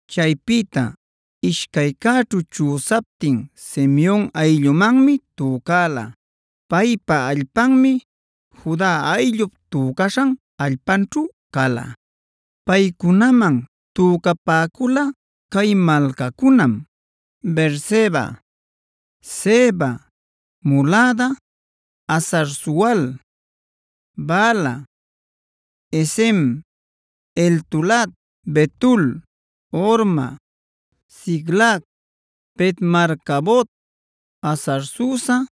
Chaypïta ishcaycäćhu chüsaptin Simeon ayllumanmi tücäla. Paypa allpanmi Juda ayllup tücaśhan allpanćhu cala. Paycunaman tücapäcula cay malcacunam: Beerseba, Seba, Molada, Hazar-sual, Bala, Ezem, Eltolad, Betul, Horma, Siclag, Bet-marcabot, Hazar-susa,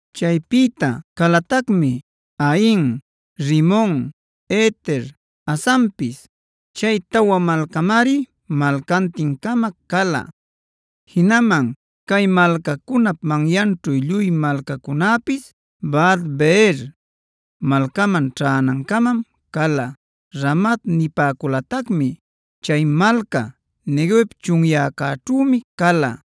Chaypïta calatacmi: Ain, Rimon, Eter, Asanpis. Chay tawa malcamari malcantin-cama cala. Jinaman cay malcacunap manyanćhu lluy malcacunäpis, Baalat-beer malcaman ćhänancamam cala, Ramat nipäculatacmi. Chay malca Neguev chunyäcäćhümi cala.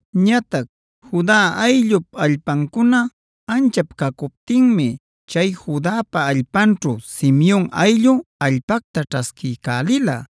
Ñatac Juda ayllup allpancuna anchap cacuptinmi chay Judapa allpanćhu Simeon ayllu allpacta ćhasquiycälila.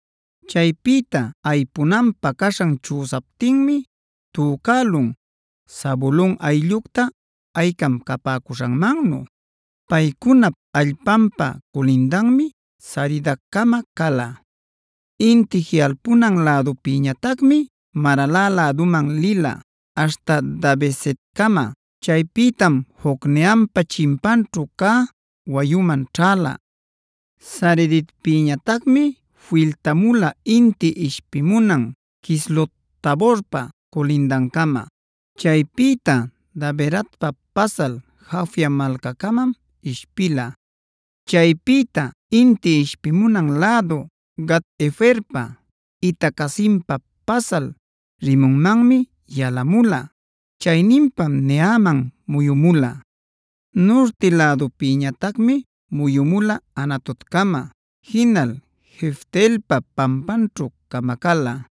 Chaypïta aypunanpä caśhan chüsaptinmi tücälun Zabulon ayllucta aycam capäcuśhanmannu. Paycunap allpanpa culindanmi Saridcama cala. Inti jiꞌalpunan lädupïñatacmi Marala läduman lila aśhta Dabesetcama. Chaypïtam Jocneampa chimpaćhu cä wayuman ćhäla. Saridpïñatacmi filtamula inti ishpimunan Quislot-taborpa culindancama. Chaypïta Daberatpa pasal Jafia malcäcamam ishpila. Chaypïta inti ishpimunan lädu Gat-heferpa, Ita-cazinpa pasal Rimonmanmi yalamula; chayninpam Neaman muyumula. Nurti lädupñatacmi muyumula Hanatoncama, jinal Jefte-elpa pampanćhu camacäla.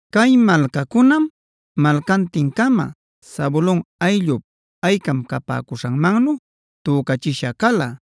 Cay malcacunam malcantin-cama Zabulon ayllup aycam capäcuśhanmannu tücachisha cala.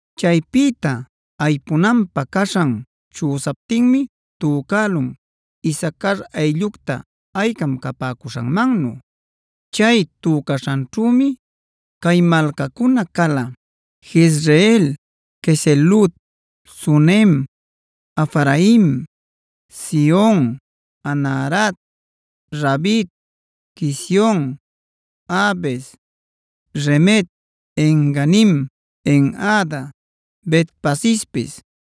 Chaypïta aypunanpä caśhan chüsaptinmi tücälun Isacar ayllucta aycam capäcuśhanmannu. Chay tücaśhanćhümi cay malcacunaca cala: Jezreel, Quesulot, Sunem, Hafaraim, Sihon, Anaharat, Rabit, Quision, Abez, Remet, En-ganim, En-hada, Bet-pasespis.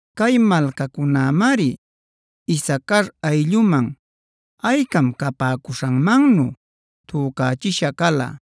Cay malcacunämari Isacar aylluman aycam capäcuśhanmannu tücachisha cala.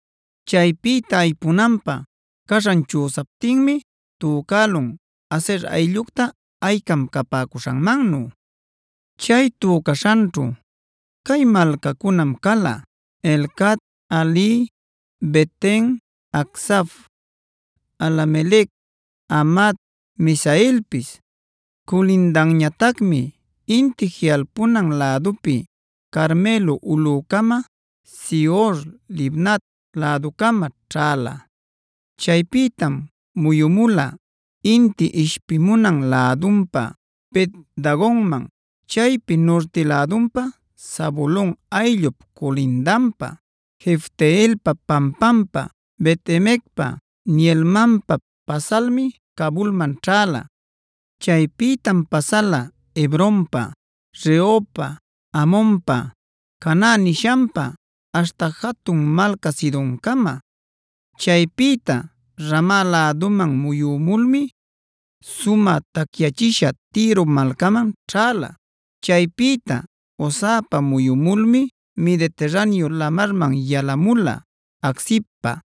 Chaypïta aypunanpä caśhan chüsaptinmi tücälun Aser ayllucta aycam capäcuśhanmannu. Chay tücaśhanćhu cay malcacunam cala: Helcat, Hali, Beten, Acsaf, Alamelec, Amad, Misealpis. Culindanñatacmi inti jiꞌalpunan lädupi Carmelo ulꞌücama, Sihor-libnat läducama ćhäla. Chaypïtam muyumula inti ishpimunan lädunpa Bet-dagonman. Chaypi nurti lädunpa Zabulon ayllup culindanpa, Jefte-elpa pampampa, Bet-emecpa, Neielmanpa pasalmi Cabulman ćhäla. Chaypïtam pasala Hebronpa, Rehobpa, Hamonpa, Caná nishanpa aśhta jatun malca Sidoncama. Chaypïta Rama läduman muyumulmi sumä tacyächisha Tiro malcaman ćhäla. Chaypïta Hosapa muyumulmi Mediterraneo lamarman yalamula Aczibpa.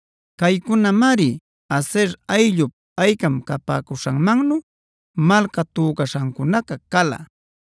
Caycunamari Aser ayllup aycam capäcuśhanmannu malca tücaśhancunaca cala.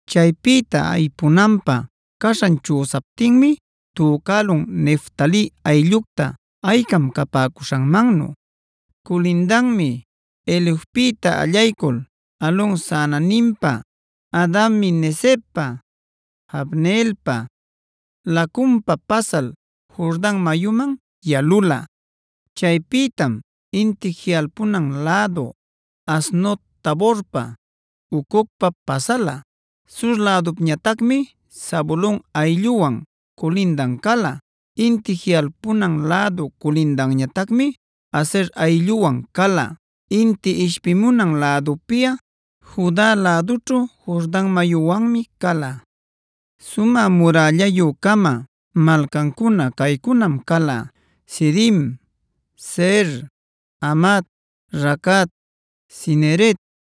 Chaypïta aypunanpä caśhan chüsaptinmi tücälun Neftali ayllucta aycam capäcuśhanmannu. Culindanmi Helefpïta allaycul Alon-saananimpa, Adami-necebpa, Jabneelpa, Lacumpa pasal Jordan mayuman yalula. Chaypïtam inti jiꞌalpunan lädu Aznot-taborpa, Hucocpa pasala. Sur lädupañatacmi Zabulon aylluwan culindan cala. Inti jiꞌalpunan lädu culindanñatacmi Aser aylluwan cala. Inti ishpimunan lädupiꞌa Juda lädućhu Jordan mayuwanmi cala. Sumä murällayü-cama malcancuna caycunam cala: Sidim, Zer, Hamat, Racat, Cineret,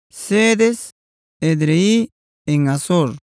Cedes, Edrei, En-hazor,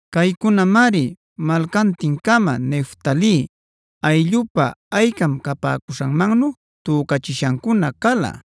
Caycunamari malcantin-cama Neftali ayllupa aycam capäcuśhanmannu tücachishancuna cala.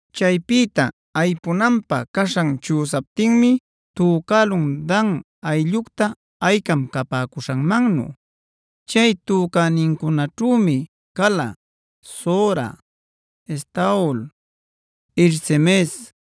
Chaypïta aypunanpä caśhan chüsaptinmi tücälun Dan ayllucta aycam capäcuśhanmannu. Chay tücänincunaćhümi cala: Zora, Estaol, Ir-semes,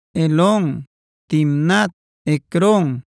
Elon, Timnat, Ecron,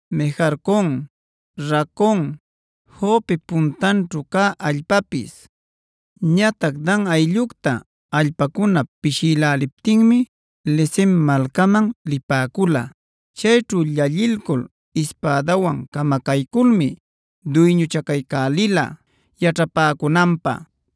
Mejarcon, Racon, Jopep puntanćhu cä allpapis. Ñatac Dan ayllucta allpacuna pishïläliptinmi Lesem malcaman lipäcula. Chayćhu llallilcul ispädawan camacayculmi duyñuchacaycälila yaćhapäcunanpä.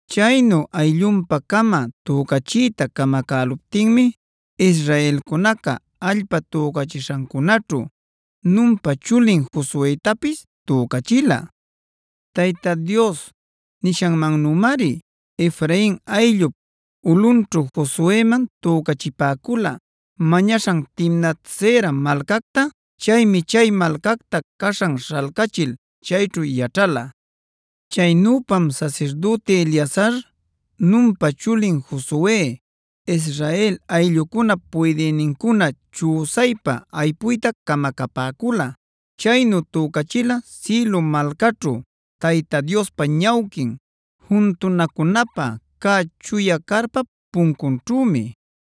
Chaynu ayllunpa-cama tücachiyta camacäluptinmi Israelcunaca allpa tücaśhancunäćhu Nunpa chulin Josuetapis tücachila. Tayta Dios nishanmannümari Efrain ayllup ulꞌunćhu Josueman tücachipäcula mañaśhan Timnat-sera malcacta. Chaymi chay malcacta caśhan śhalcachil chayćhu yaćhala. Chaynüpam sasirdüti Eleazar, Nunpa chulin Josue, Israel ayllucunap puydïnincuna chüsaypa aypuyta camacapäcula. Chaynu tücachila Silo malcaćhu Tayta Diospa ñawquin, juntunacunapä cä chuya carpap puncunćhümi.